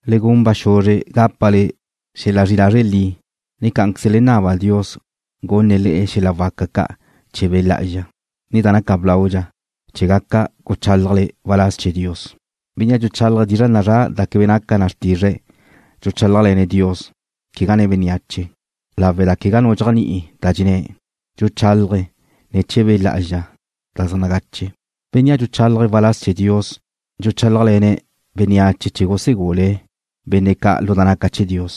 Le gun ba xuzre gápale xel-la zri'i lazre' li, ne cá'anqueze le naba Dios gunne̱' le'e xel-la waca ca' chee̱ Be' Lá'azxa, ne da naca blaudxa, chee̱ gaca guchálajle waláz chee̱ Dios. Bénnea' dxuchálaje̱' dizra' nazrá' da quebe naca na xrtizre̱' dxuchálajle̱ne̱' Dios, quegá nen bénneache, lawe' da quegá nu dxéajni'i da dxenné̱'. Dxuchálaje̱' ne̱ chee̱ Be' Lá'azxa da zaj nagache. Bénnea' dxuchálaje̱' waláz chee̱ Dios dxuchálajle̱ne̱' bénneache chee̱ gusegule̱' benne' ca' lu da naca chee̱ Dios,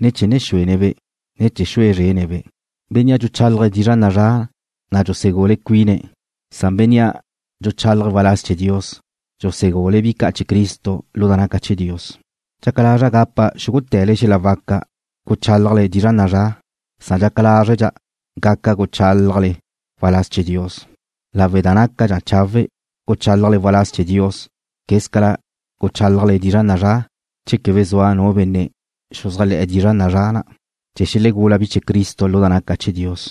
ne chee̱ ne̱ xúene̱'-be', ne chee̱ xue zrene̱'-be'. Bénnea' dxuchálaje̱' dizra' nazrá' na' dxusegula cuine̱', san bénnea' dxuchálaje̱' waláz chee̱ Dios dxusegule̱' bi ca' chee̱ Cristo lu da naca chee̱ Dios. Dxaca lazra' gapa xúgute̱le xel-la waca guchálajle dizra' nazrá', san dxaca lázredxa' gaca guchálajle waláz chee̱ Dios, lawe' da nácadxa chawe' guchálajle waláz chee̱ Dios quézcala guchálajle dizra' nazrá', che quebe zua nu benne' xuzájle̱'e̱ dizra' nazrá' na' chee̱ xelegula bi chee̱ Cristo lu da naca chee̱ Dios.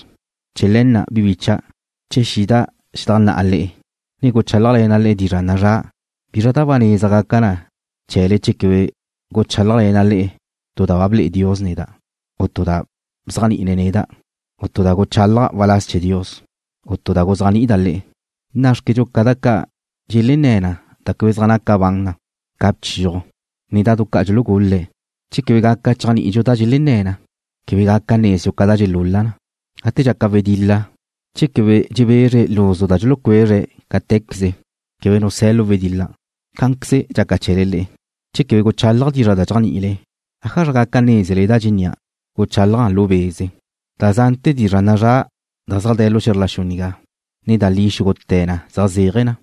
Chee̱ le̱ na', bi bícha'dau', che xida' xedajnná'a le'e, ne guchálajle̱na' le'e dizra' nazrá', ¿bizra da ba neza gaca na chee̱le che quebe guchálajle̱na' le'e tu da ba ble'e Dios neda', u tu da bzéajni'ine̱' neda', u tu da guchálaja' waláz chee̱ Dios, u tu da guzéajni'ida' le'e? Nná'xquedxu ca da ca' dxelenné̱ na da quebe zaj naca bane na ca bchiuj, ne bihuel-la. Che quebe gaca chéajni'idxu da dxelenné̱ na, quebe gaca nezdxu ca da dxelul-la na. Gate dxaca wedil-la, che quebe dxebezre luzu da dxulucuezre̱' cáte̱queze, quebe nu se̱ lu wedil-la. Cá'anqueze dxaca chee̱le le'e. Che quebe guchálaja' dizra' da dxéajni'ile, ¿ájazra gaca nézele da dxennía'? Guchálaja' lu be'. Da zante̱ dizra' nazrá' zaj de̱ lu xe̱zr la xu nigá, ne da li xúgute̱ na zaj zéaje̱ na.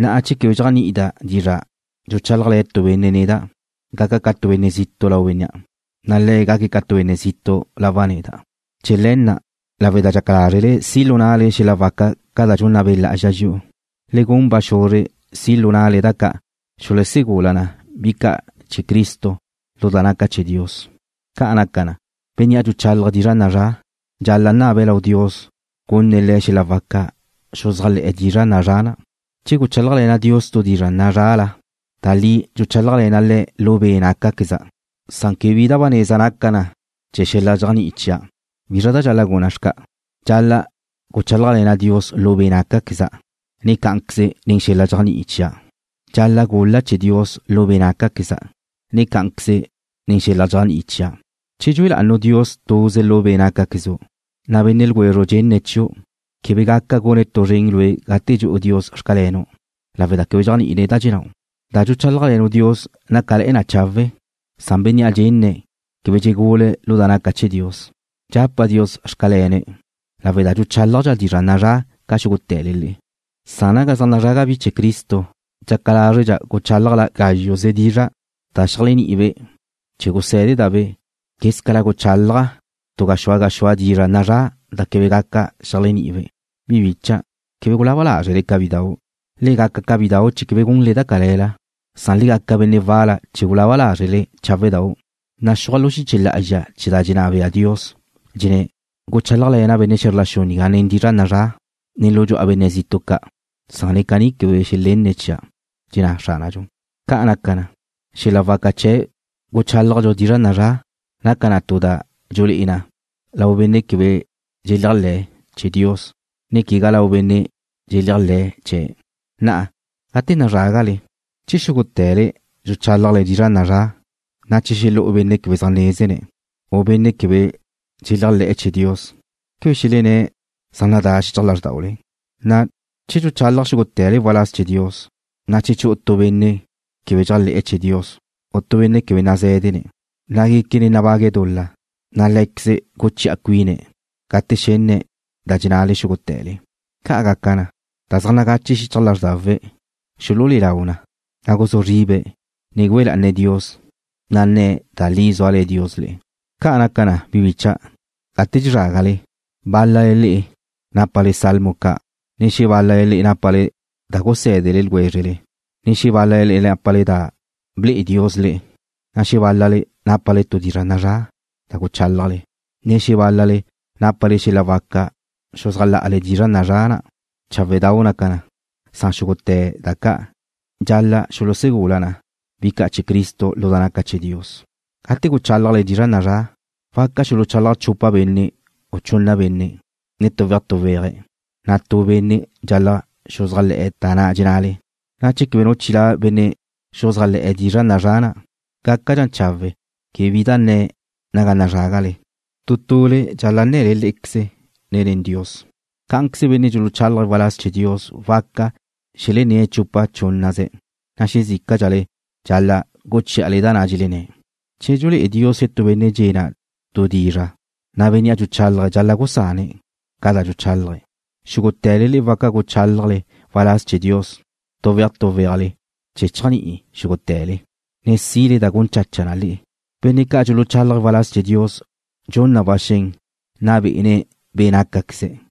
Na'a che quebe dxéajni'ida' dizra' dxuchálajle̱ tu benne' neda', gaca' ca tu benne' zitu' lau bénnea', na' le̱' gaque̱' ca tu benne' zitu' lawa' neda'. Chee̱ le̱ na', lawe' da dxaca lázrele si' lu na'le xel-la waca ca' da dxunna Be' Lá'azxa dxi'u, le gun ba xuzre si' lu na'le da ca' xulusegula na bi ca' chee̱ Cristo lu da naca chee̱ Dios. Ca' naca na, bénnea' dxuchálaje̱' dizra' nazrá' dxal-la' naba lau Dios gunne̱' le̱' xel-la waca xuzájle̱'e̱ dizra' nazrá' na'. Che guchálajle̱na' Dios tu dizra' nazrá'la, da li dxuchálajle̱na' Le̱' lu be' nácaqueza', san quebe bi da ba neza naca na chee̱ xel-la dxéajni'i chia'. ¿Bizra da dxal-la' guna' xca'? Dxal-la' guchálajle̱na' Dios lu be' nácaqueza', ne cá'anqueze nen xel-la dxéajni'i chia'. Dxal-la' gul-la' chee̱ Dios lu be' nácaqueza', ne cá'anqueze nen xel-la dxéajni'i chia'. Che dxue la'anu' Dios tuze lu be' nácaquezu', na' benne' ljwezru' dxenne̱' chiu' quebe gaca gune̱' tu zren lue' gate dxu'u Dios: Xcalenu', lawe' da quebe dxéajni'ine̱' da dxennáu'. Da dxuchálajle̱nu' Dios nácale̱'e̱ na chawe', san bénnea' dxenne̱' quebe dxegule̱' lu da naca chee̱ Dios. Dxapa' Dios: Xcale̱ne̱' lawe' da dxuchálajdxa' dizra' nazrá' ca xúgute̱le le'e, san naga zaj nazraga bi chee̱ Cristo dxaca lázredxa' guchálaja' gázxuze dizra' da xeléajni'ibe' chee̱ gusé̱deda'-be', quézcala guchálaja' chi mila dizra' nazrá' da quebe gaca xeléajni'ibe'. Bi bícha'dau'. Quebe gulaba lázrele ca bidau'. Le gaca ca bidau' chee̱ quebe gunle da cale̱la, san le gaca benne' wal-la chee̱ gulaba lázrele cháwe'dau'. Naxúaj lu xiche lá'azxa chee̱ da dxenná bea Dios, da dxenná na: Guchálajle̱na' benne' xe̱zr la xu nigá nen dizra' nazrá', ne lu dxu'a benne' zitu' ca', san ne caní quebe xelenne̱' chia'. Caní dxenná Xránadxu. Ca' naca na, xel-la waca chee̱ guchálajdxu dizra' nazrá' naca na tu da dxulé'e na lau benne' quebe dxeléajle̱'e̱ chee̱ Dios, ne quegá lau benne' dxeléajle̱'e̱ chee̱'. Na'a, gate nazrágale, che xúgute̱le dxuchálajle dizra' nazrá', na' che xelexú'u benne' quebe zaj nazé̱dene̱', u benne' quebe dxeléajle̱'e̱ chee̱ Dios, ¿quebe xelenné̱' zaj nadá xichaj lázrdaule? Na'a che dxuchalaj xúgute̱le waláz chee̱ Dios, na' che chu'u tu benne' quebe dxéajle̱'e̱ chee̱ Dios, u tu benne' quebe nazé̱dene̱', na' guéquene̱' nabague̱' dul-la, na' lé̱queze̱' guchi'a cuine̱' gate xenne̱' da dxennale xúgute̱le. Ca' gaca na, da zaj nagache xichaj lázrdawe̱' xululé'e lau na, na' guzúa zribe̱', ne güe lá'ane̱' Dios, na' nne̱' da li zúale̱ Dios le'e. Ca' naca na, bi bícha'dau', gate dxezrágale, bál-lale le'e nápale salmo ca', ne xebál-lale nápale da gusé̱dele ljwézrele, ne xebál-lale nápale tu da ble'e Dios le'e, ne xebál-lale nápale tu dizra' nazrá' da guchálajle, ne xebál-lale nápale xel-la waca xuzájla'ale dizra' nazrá' na'. Cháwe'dau' naca na, san xúgute̱ da ca' dxal-la' xulusegula na bi ca' chee̱ Cristo lu da naca chee̱ Dios. Gate guchálajle dizra' nazrá', waca xuluchalaj chupa benne', u chunna benne', ne tuwéaj tuwéajle, na' tu benne' dxal-la' xuzájle̱'e̱ da dxennale. Na'a che quebe nu chilá' benne' xuzájle̱'e̱ dizra' nazrá' na', gácadxa chawe' quebe bi da nne̱' naga nazrágale. Tu tule dxal-la' nnale lé'equezle, ne nen Dios. Cá'anqueze benne' dxuluchálaje̱' waláz chee̱ Dios waca xelenné̱' chupa chúnnaze̱', na' xezícadxale dxal-la' guchí'ale da na' dxenné̱'. Che dxulé'e Dios xetú benne' dxe'e̱ na' tu dizra', na' bénnea' dxuchálaje̱' dxal-la' gusane̱' ca da dxuchálaje̱'. Xúgute̱le le'e waca guchálajle waláz chee̱ Dios tuwéaj tuwéajle chee̱ chéajni'i xúgute̱le, ne sile da gun chacha na le'e. Benne' ca' dxuluchálaje̱' waláz chee̱ Dios dxun na ba xen nna bé'ene̱' be' nácaqueze̱',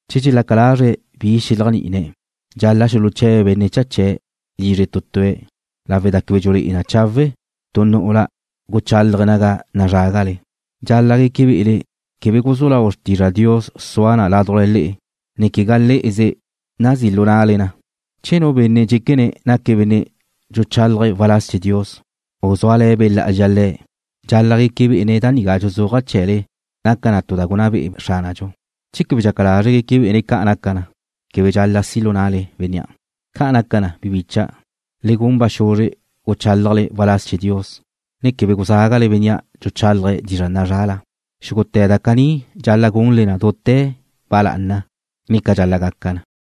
Che dxelaca lazre̱' bi xeléajni'ine̱', dxal-la' xuluche̱be̱' benne' cha chee̱' lizre tu tue̱' lawe' da quebe dxulé'e na chawe' tu nu'ula guchálaje̱' naga nazrágale. Dxal-la' gueque be'ele quebe guzú lau xrtizra Dios sua na ládujla le'e, ne quegá le'eze nazí' lu na'le na. Che nu benne' dxéquene̱' naque̱' benne' dxuchálaje̱' waláz chee̱ Dios, u zúale̱ Be' Lá'azxa le̱', dxal-la' gueque bé'ene̱' da nigá dxuzúaja' chee̱le naca na tu da gunná be'e Xránadxu. Che quebe dxaca lazre̱' gueque bé'ene̱' da nigá, quebe dxal-la' si' lu na'le bénnea'. Ca' naca na, bi bícha'dau', le gun ba xuzre guchálajle waláz chee̱ Dios, ne quebe guzágale bénnea' dxuchálaje̱' dizra' nazrá'la. Xúgute̱ da caní dxal-la' gunle dute̱ ba lá'ana, ne ca dxal-la' gaca na.